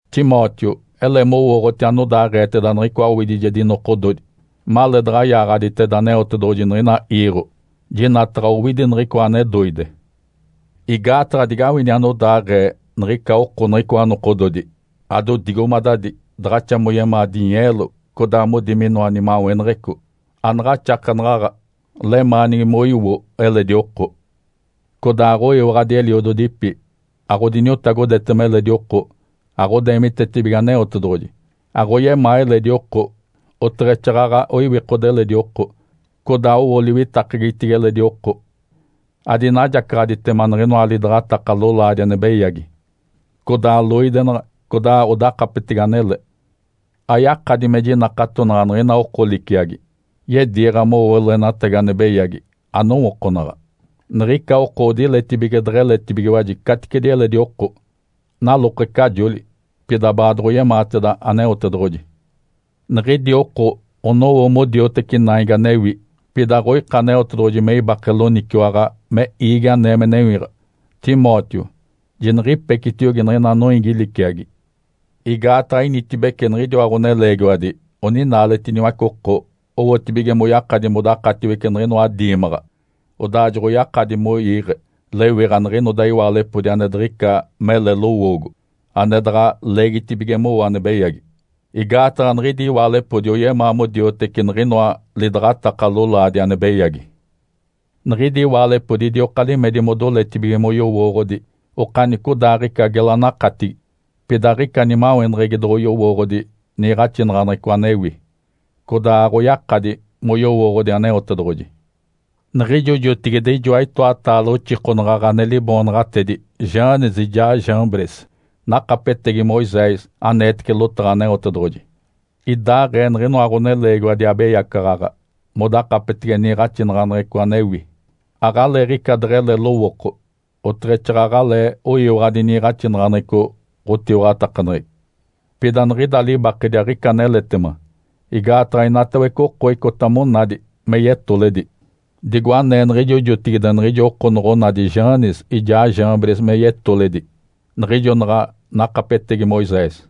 Timóteo, ele mowooɡ̶oti anodaaɡ̶eeteda niɡ̶icoa owidijedi nokododi, maleedaɡ̶a yaaɡ̶aditeda Aneotedoɡ̶oji niɡ̶ina iiɡ̶o, jinataɡ̶a owidi niɡ̶icoa ane doide. Igaataɡ̶a digawini anodaaɡ̶ee niɡ̶ica oko niɡ̶icoa nokododi: Adodigomadadi, daɡ̶axa moyemaa dinyeelo, codaa modi minoa nimaweneɡ̶eco, anaɡ̶axakenaɡ̶aɡ̶a, lemaanigi moiwo eledi oko. Codaa aɡ̶oyiwaɡ̶adi eliododipi, aɡ̶odiniotagodetema eledi oko, aɡ̶odeemitetibige Aneotedoɡ̶oji, aɡ̶oyemaa eledi oko, oteɡ̶exaaɡ̶aɡ̶a oiwikode eledi oko. Codaa owo liwitakegitigi eledi oko, adinajacaɡ̶aditema niɡ̶inoa lidaɡ̶ataka lolaadi ane beyagi, codaa loidenaɡ̶a, codaa odakapetege anele. Ayakadi me jinakatonaɡ̶a niɡ̶ina oko liciagi, yediiɡ̶a mowo loenatagi ane beyagi anowookonaɡ̶a. Niɡ̶ica oko odiletibige deɡ̶eletibigiwaji caticedi eledi oko, nalokecajoli, pida baadoɡ̶oyemaateda Aneotedoɡ̶oji. Niɡ̶idi oko onowo modioteci naigi anewi, pida aɡ̶oika Aneotedoɡ̶oji me ibake loniciwaɡ̶a me iigi anee me newiɡ̶a. Timóteo, jiniɡ̶ipecitiogi niɡ̶ina noiigi liciagi. Igaataɡ̶a initibece niɡ̶idiwa ɡ̶oneleegiwadi oninaaletiniwace oko owotibige moyakadi modakatiwece niɡ̶inoa diimaɡ̶a. Odaa joɡ̶oyakadi moiiɡ̶e lewiɡ̶a niɡ̶inoda iwaalepodi ane diɡ̶ica mele lowoogo, ane daɡ̶a leegitibige mowo ane beyagi. Igaataɡ̶a niɡ̶idi iwaalepodi oyemaa modioteci niɡ̶inoa lidaɡ̶ataka lolaadi ane beyagi. Niɡ̶idi iwaalepodi idioka limedi modoletibige moyowooɡ̶odi okanicodaaɡ̶ica gela nakatigi, pida aɡ̶ica nimaweneɡ̶egi doɡ̶oyowooɡ̶odi niiɡ̶axinaɡ̶aneɡ̶eco anewi, codaa aɡ̶oyakadi moyowooɡ̶odi Aneotedoɡ̶oji. Niɡ̶ijo jotigide ijoa itoataale oxikonaɡ̶aɡ̶a ane liboonaɡ̶atedi Janes ijaa Jambres nakapetegi Moisés aneetece lotaɡ̶a Aneotedoɡ̶oji. Idaaɡ̶ee niɡ̶inoa ɡ̶oneleegiwadi abeyacaɡ̶aɡ̶a modakapetege niiɡ̶axinaɡ̶aneɡ̶eco anewi. Aɡ̶aleeɡ̶ica deɡ̶ele lowooko, oteɡ̶exaaɡ̶aɡ̶alee oyiwaɡ̶adi niiɡ̶axinaɡ̶aneɡ̶eco ɡ̶otiwaɡ̶atakaneɡ̶egi. Pida niɡ̶ida libakedi aɡ̶ica aneletema, igaataɡ̶a inatawece oko icota monadi me yetoledi, digo anee niɡ̶ijo jotigide niɡ̶ijo oko noɡ̶onadi Janes ijaa Jambres me yetoledi niɡ̶ijo naɡ̶a nakapetegi Moisés.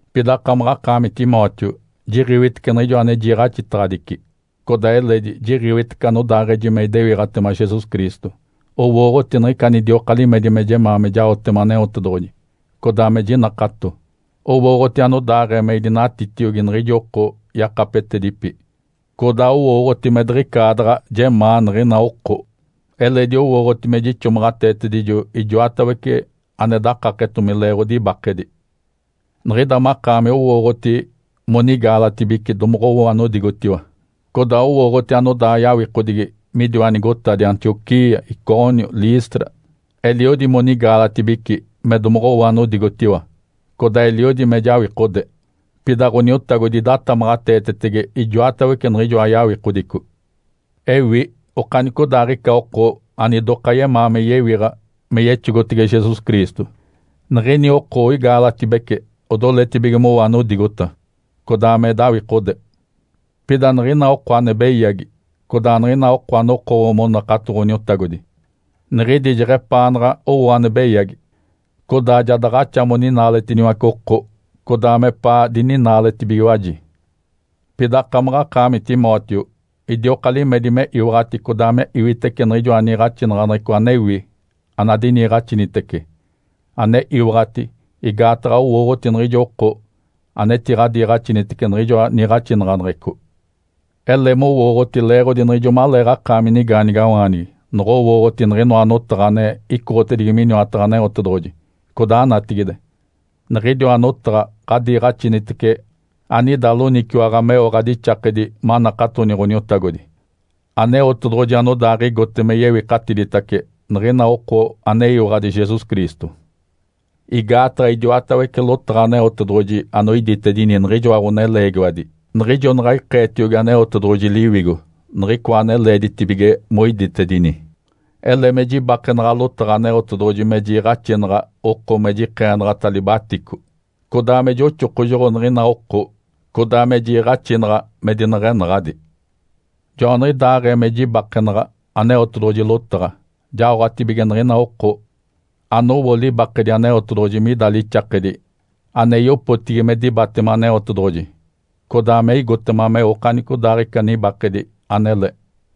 Pida akamaɡ̶akaami Timóteo jiɡ̶iwitece niɡ̶ijo ane jiiɡ̶axitaɡ̶adici, codaa eledi jiɡ̶iwitece anodaaɡ̶eji me idewiɡ̶atema Jesus Cristo, owooɡ̶oti niɡ̶ica anidioka limedi me jemaa me jaotema Aneotedoɡ̶oji, codaa me jinakato, owooɡ̶oti anodaaɡ̶ee me idinatitiogi niɡ̶ijo oko yakapetedipi, codaa owooɡ̶oti me diɡ̶icaadaɡ̶a jemaa niɡ̶ina oko, eledi owooɡ̶oti me jixomaɡ̶ateetedijo ijoatawece ane dakaketomi leeɡ̶odi ibakedi. Niɡ̶ida makaami owooɡ̶oti monigaalatibici domoɡ̶owo anodigotiwa, codaa owooɡ̶oti anodaa yawikodigi midiwa nigotadi Antioquia, Icônio, Listra. Eliodi monigaalatibici me domoɡ̶owo anodigotiwa, codaa eliodi me jawikode. Pida Ǥoniotagodi idatamaɡ̶ateetetege ijoatawece niɡ̶ijoa yawikodico. Ewi okanicodaaɡ̶ica oko anidoka yemaa me yewiɡ̶a me yexogotege Jesus Cristo, niɡ̶ini oko oigaalatibece odoletibige mowo anodigota, codaa me dawikode. Pida niɡ̶ina oko ane beyagi, codaa niɡ̶ina oko anokowo monakato Ǥoniotagodi, niɡ̶idi jeɡ̶epaanaɡ̶a owo ane beyagi. Codaa ja daɡ̶axa moninaaletiniwace oko, codaa mepaa dininaaletibigiwaji. Pida akamaɡ̶akaami Timóteo idioka limedi me iwaɡ̶ati codaa me iwitece niɡ̶ijoa niiɡ̶axinaɡ̶aneɡ̶eco anewi anadiniiɡ̶axinitece, ane iwaɡ̶ati, igaataɡ̶a owooɡ̶oti niɡ̶ijo oko anetiɡ̶adiiɡ̶axinitece niɡ̶ijoa niiɡ̶axinaɡ̶aneɡ̶eco. Ele mowooɡ̶oti leeɡ̶odi niɡ̶ijo maleeɡ̶akaami nigaanigawaanigi noɡ̶owooɡ̶oti niɡ̶inoa notaɡ̶a ane icoɡ̶otedigi miniwataɡ̶a Aneotedoɡ̶oji, codaa natigide. Niɡ̶idiwa notaɡ̶a ɡ̶adiiɡ̶axinitece, anida loniciwaɡ̶a meo ɡ̶adixakedi manakatoni Ǥoniotagodi. Aneotedoɡ̶oji anodaaɡ̶igote me yewikatiditace niɡ̶ina oko aneyiwaɡ̶adi Jesus Cristo. Igaataɡ̶a idiwatawece lotaɡ̶a Aneotedoɡ̶oji anoiditedini niɡ̶ijoa ɡ̶oneleegiwadi niɡ̶ijo naɡ̶a ikeetediogi Aneotedoɡ̶oji Liwigo niɡ̶ica ane leeditibige moiditedini. Ele me jibakenaɡ̶a lotaɡ̶a Aneotedoɡ̶oji me jiiɡ̶axinaɡ̶a oko me jikeenaɡ̶ata libatico, codaa me joxokojoɡ̶o niɡ̶ina oko, codaa me jiiɡ̶axinaɡ̶a me dineɡ̶enaɡ̶adi. Joaniɡ̶idaaɡ̶ee me jibakenaɡ̶a Aneotedoɡ̶oji lotaɡ̶a, jaoɡ̶atibige niɡ̶ina oko anowo libakedi Aneotedoɡ̶oji mida lixakedi ane yopotigi me dibatema Aneotedoɡ̶oji, codaa me igotema meo okanicodaaɡ̶ica nibakedi anele.